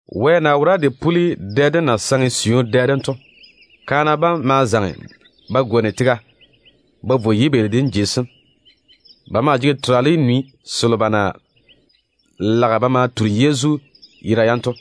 Wɛ na wora de puli dɛ dem na saŋe siu dɛ dem to, Ko kuri mo ye ‘Sunday’ tetete. kaana bam ma zaŋe ba gwoni tega ba vo yibeeli dem jei sem. Ba maa jege terale nwi selo ba na lage ba ma turi Yezu yera yam to.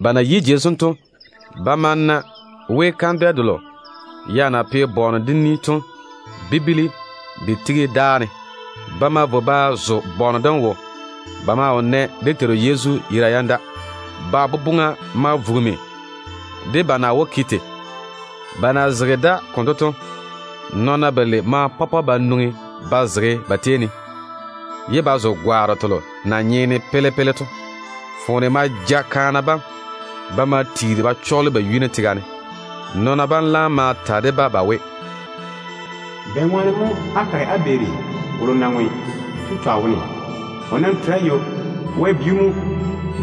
Ba na yi jei sem to, ba ma na we kandwɛ delo ya na pe bɔɔne dem ni to bibili de tigi dáa ne. Ba ma vo ba zo bɔɔne dem wo. Ba maa wo nɛ dé Teiru Yezu yera yam da. Ba boboŋa ma vugimi de ba na wó ke tei. Ba na zege da konto to, nɔɔna balei ma pɔpɔ ba nwoŋi ba zege ba tei ne, ye ba zo gwaaro telo na nyeene pele-pele to. Foone ma ja kaana bam. Ba ma tiiri ba chɔɔle ba yuni tega ne. Nɔɔna bam laam ma ta de-ba ba we, “Bɛŋwaane mo á kare á beeri wolo na ŋwe to twa wone? O nam tere ywo. Wɛ bi‑o mo.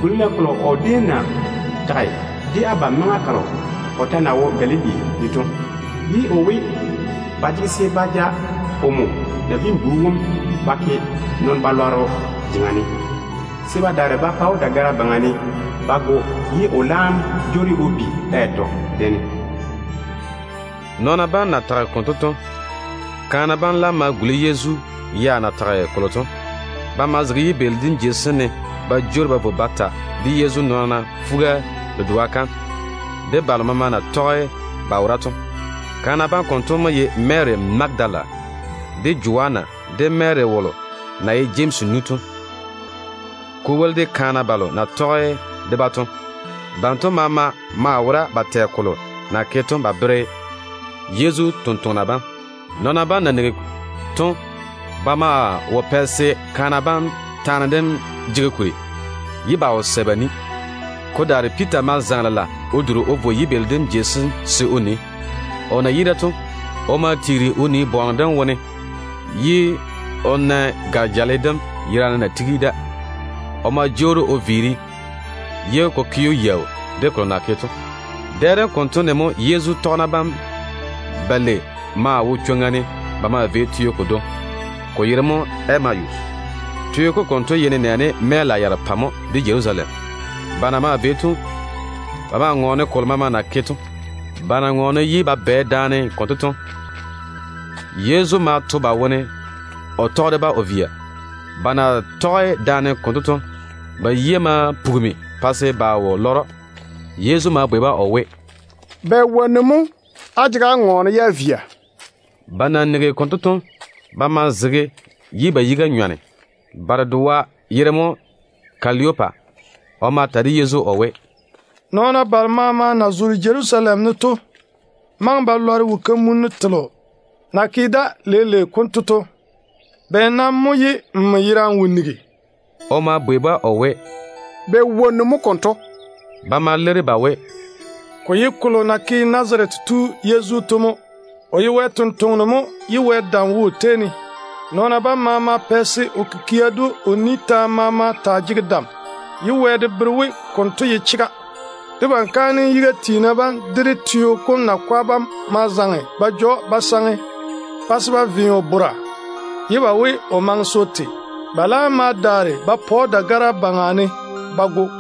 Guli-na kolo o déem na tage de abam maŋa kalo o ta na wo Galili ne to, ye o we, ba jege se ba ja omo Nabiin-bu wom ba ke nɔn-chechɔgero jeŋa ne, se ba daare ba pa‑o dagara yuu ne ba go, ye o laam jwoori o bi da yatɔ dɛ ne.” Nɔɔna bam na tage konto to, kaana bam laam ma guli Yezu ya na tage kolo to. Ba ma zege yibeeli dem jei sem ne ba jwoori ba vo ba ta de Yezu nɔɔna fuga-dedoa kam, de balo maama na tɔge ba wora to. Kaana bam konto mo ye Mary Magadala, de Joanna, de Mary wolo na ye Jemsi nu to, ko woli de kaana balo na tɔge de-ba to. Banto maama maa wora ba tɛ kolo na ke to ba bere Yezu totoŋa nakwa bam. Nɔɔna bam na nigi to, ba maa wo pɛ se kaana bam taane dem jege kuri, ye ba wo sɛ ba ni. Ko daare Piita ma zaŋe lela o duri o vo yibeeli dem jei sem se o nii. O na yi da to, o ma tiiri o nii bɔɔne dem wone ye o na gare-jale dem yerane na tigi da. O ma jwoori o viiri ye ko ke‑o yaau de kolo na ke to. Dɛ dem konto ne mo Yezu tɔgena bam balei maa wo chwoŋa ne ba maa vei teo kodwoŋi, ko yere mo Emayus. Teo kom konto ye nenɛɛne mɛɛla yarepɛ mo de Jerusalem. Ba na maa vei to, ba maa ŋɔɔne kolo maama na ke to. Ba na ŋɔɔne ye ba bwɛ daane konto to, Yezu ma to ba wone o tɔge de-ba o via. Ba na tɔge daane konto to, ba yia ma pugimi pa se ba wo lɔre‑o. Yezu ma bwei-ba o we, “Bɛ wonnu mo abam jege á ŋɔɔna ye á via?” Ba na nigi konto to, ba ma zege ye ba yiga nyɔne. Ba dedoa yere mo Kelopasa. O ma ta de Yezu o we, “Nɔɔna balo maama na zoore Jerusalem ne to maŋe ba lɔre wo-kamunnu telo na ke da leile konto to. Bɛ nam mo ye nmo yerane wo nigi?” O ma bwei-ba o we, “Bɛ wonnu mo konto?” Ba ma leiri ba we, “Ko ye kolo na ke Nazarete tu Yezu to mo. O ye Wɛ ni-jwoŋinu mo ye Wɛ dam wo o tei ne. Nɔɔna bam maama pɛ se o kikia de o ni taane maama taa jege dam, ye Wɛ de bere we konto ye chega. Debam kaanem yiga tiina bam de dé teo kom nakwa bam ma zaŋe ba ja‑o ba saŋe, pa se ba ve o bora, ye ba we o maŋe se o te. Ba laam ma daare ba pa‑o dagara yuu ne ba go.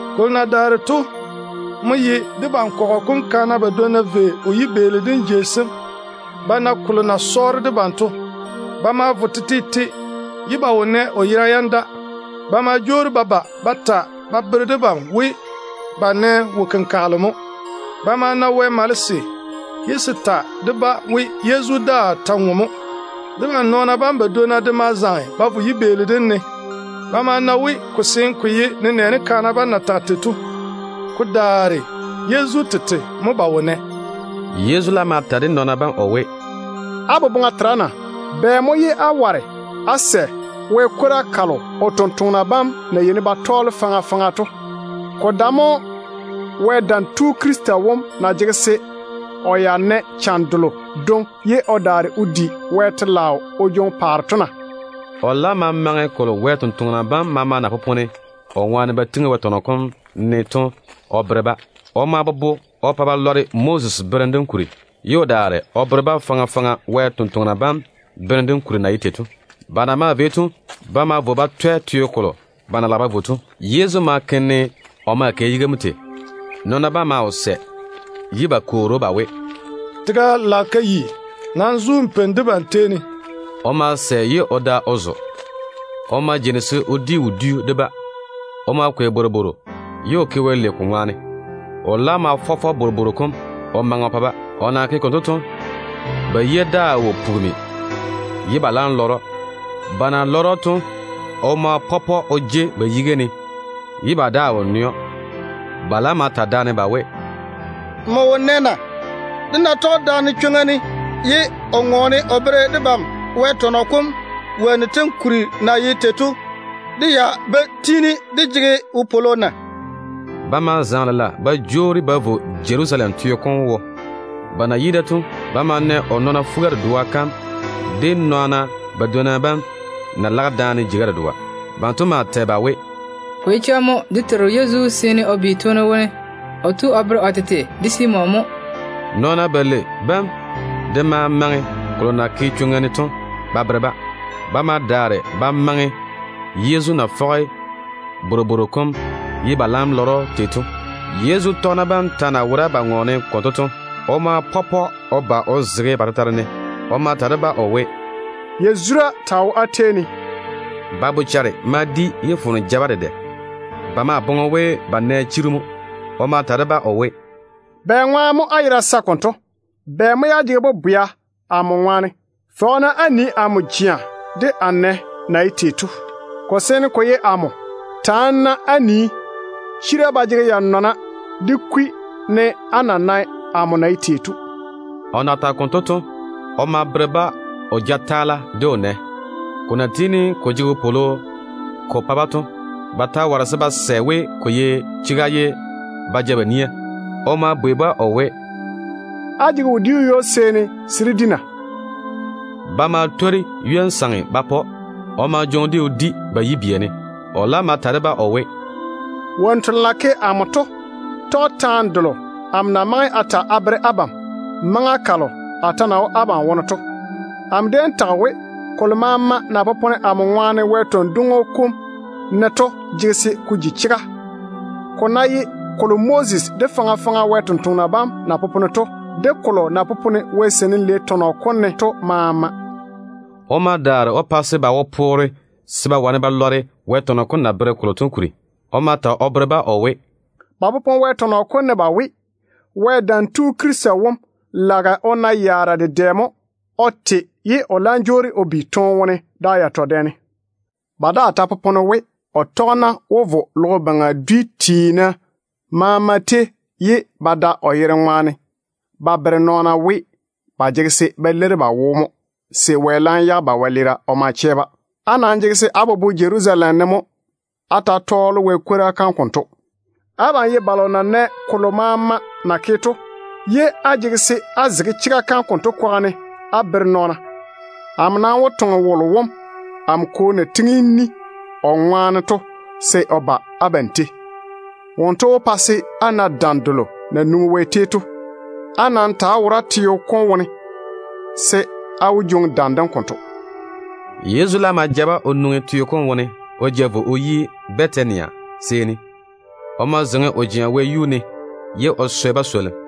Kolo na daare to mo ye debam kɔgɔ kom kaana badwonna vei o yibeeli dem jei sem ba na kolo na sɔɔre debam yera to. Ba ma vo tetete ye ba wo nɛ o yera yam da. Ba ma jwoori ba ba ba ta ba bere debam we ba nɛ wo-kenkagele mo. Ba ma na Wɛ malese, ye se ta de-ba we Yezu daa ta ŋwe mo. Debam nɔɔna bam badwonna de ma zaŋe ba vo yibeeli dem ne. Ba ma na we ko seene ko ye nenɛɛne kaana bam na tage tei to. Ko daare Yezu tete mo ba wo nɛ.” Yezu laam ma ta de nɔɔna bam o we, “Á boboŋa tera na? Bɛ mo ye á ware á sɛ Wɛ kwora kalo o sampwori sem na yeini ba tɔɔle faŋa faŋa to? Ko dae mo Wɛ Dam Tu Krista wom na jege se o na yaara yalo, ye o daare o di Wɛ telaao o jwoŋi o paare to na?” O laam ma maŋe kolo maama na popone o ŋwaane ko tiŋi Wɛ tɔnɔ kom ne to o bere-ba. O ma bobo o pa ba lɔre Moses berem dem kuri, ye o daare o bere-ba faŋa faŋa Wɛ sampwori sem berem dem kuri na ye tei to. Ba na maa vei to, ba ma vo ba twɛ teo kolo ba na lage ba vo to. Yezu ma ke ne o na maa kɛ yiga mo tei. Nɔɔna bam maa wo sɛ ye ba kwoori‑o ba we, “Tega lage ka yi. Nam zo n peini debam tei ne.” O ma sɛ ye o da o zo. O ma jeini se o di wodiu de-ba. O ma kwei bworobworo ye o ke Wɛ lei ko ŋwaane. O laam ma fɔ bworobworo kom o maŋe o pa-ba. O na ke konto to, ba yia daa wo pugimi ye ba laam lɔre‑o. Ba na lɔre‑o to, o ma pɔpɔ o jei ba yiga ne ye ba daa wo nɛ‑o. Ba laam ma ta daane ba we, “Nmo wo nɛ na? Dé na tɔge daane chwoŋa ne ye o ŋɔɔne o bere debam Wɛ tɔnɔ kom wonnu tem kuri na ye tei to, dé ya ba tiini dé jege wopwolo na?” Ba ma zaŋe lela ba jwoori ba vo Jerusalem teo kom wo. Ba na yi da to, ba ma na o nɔɔna fuga-dedoa kam de nɔɔna badwonna bam na lage daane jeiga dedoa. Banto maa tɛ ba we, “Ko ye chega mo. Dé Teiru Yezu seene o bi toone wone. O tu o bere o tete de Simon mo.” Nɔɔna balei bam de ma maŋe kolo na ke chwoŋa ne to ba bere-ba. Ba ma daare ba maŋe Yezu na fɔge bworobworo kom ye ba laam lɔre‑o tei to. Yezu tɔgena bam ta na wora ba ŋɔɔne konto to, Yezu tete ma pɔpɔ o ba o zege ba tetare ne. O ma ta de-ba o we, “Yazura taa wo á tei ne.” Ba bochare ma di ye foone ja-ba dedɛ. Ba ma boŋe we ba nɛ chiru mo. O ma ta de-ba o we, “Bɛŋwaane mo á yera sae konto? Bɛ mo ye á jege bobwea amo ŋwaane? Fɔge-na á nii amo jea de a nɛ na ye tei to. Ko seene ko ye amo. Taane-na amo á nii. Chira ba jege ya-nɔna de kwi ne á na nae amo na ye tei to.” O na tage konto to, o ma bere-ba o jataala de o nɛ sem. Ko na tiini ko jege wopwolo ko pa-ba to, ba ta ware ba sɛ we ko ye chega, ye ba ja ba nia. O ma bwei-ba o we, “Á jege wodiu ywo-seeni se dé di na?” Ba ma twori ywon-saŋe ba pa‑o. O ma jwoŋi-de o di ba yibia ne. O laam ma ta de-ba o we, “Wonnu telo na ke amo to tɔge taane delo amo na maŋe a ta a bere abam maŋa kalo a ta na wo abam tetare ne to. Amo déem tage we, kolo maama na popone amo ŋwaane Wɛ tɔn-dwoŋo kom ne to jege se ko ji chega, ko ná ye kolo Moses de faŋa faŋa Wɛ sampwori sem na popone to, de kolo na popone Wɛ Seinim Lei tɔnɔ kom ne to maama.” O ma daare o pa se ba wo poore se ba wane ba lɔre Wɛ tɔnɔ kom na bere kolo to kuri. O ma ta o bere-ba o we, “Ba popone Wɛ tɔnɔ kom ne ba we, Wɛ Dam Tu Krista wom lage o na yaara dedɛ mo o te, ye o laam jwoori o bi toone wone da yatɔ dɛ ne. Ba daa ta popone we, o tɔgena wó vo logo baŋa dwi maama tei, ye ba da o yere ŋwaane ba bere nɔɔna we ba jege se ba leiri ba wo mo se Wɛ laam yage ba wɛleera o ma chɛ-ba. Á nam jege se á bobo Jerusalem ne mo á ta‑á tɔɔle Wɛ kwora kam konto. Abam ye balo na nɛ kolo maama na ke to, ye á jege se á zege chega kam konto kwaga ne á bere nɔɔna. Amo nam wó toŋe wolo wom amo Kwo na pwooli o ŋwaane to se o ba abam tei. Wonto wó pa se á na dam delo na nwoŋi Wɛ tei to. Á nam ta ta‑á wora teo kom wone, se á laam wó jwoŋi dam dem konto.” Yezu laam ma ja-ba o nwoŋi teo kom wone o ja vo o yi Bɛtania seeni. O ma zeiŋi o jea wɛyuu ne ye o swɛ ba swolim.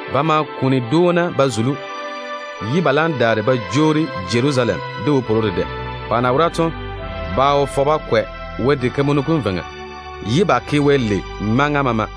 Ba ma kuni dwoona ba zuli‑o ye ba laam daare ba jwoori Jerusalem de wopwolo dedɛ. Ba na wora to, ba wo fɔge ba kwɛ Wɛ diga kam veiŋa, ye ba tei Wɛ maŋa maama.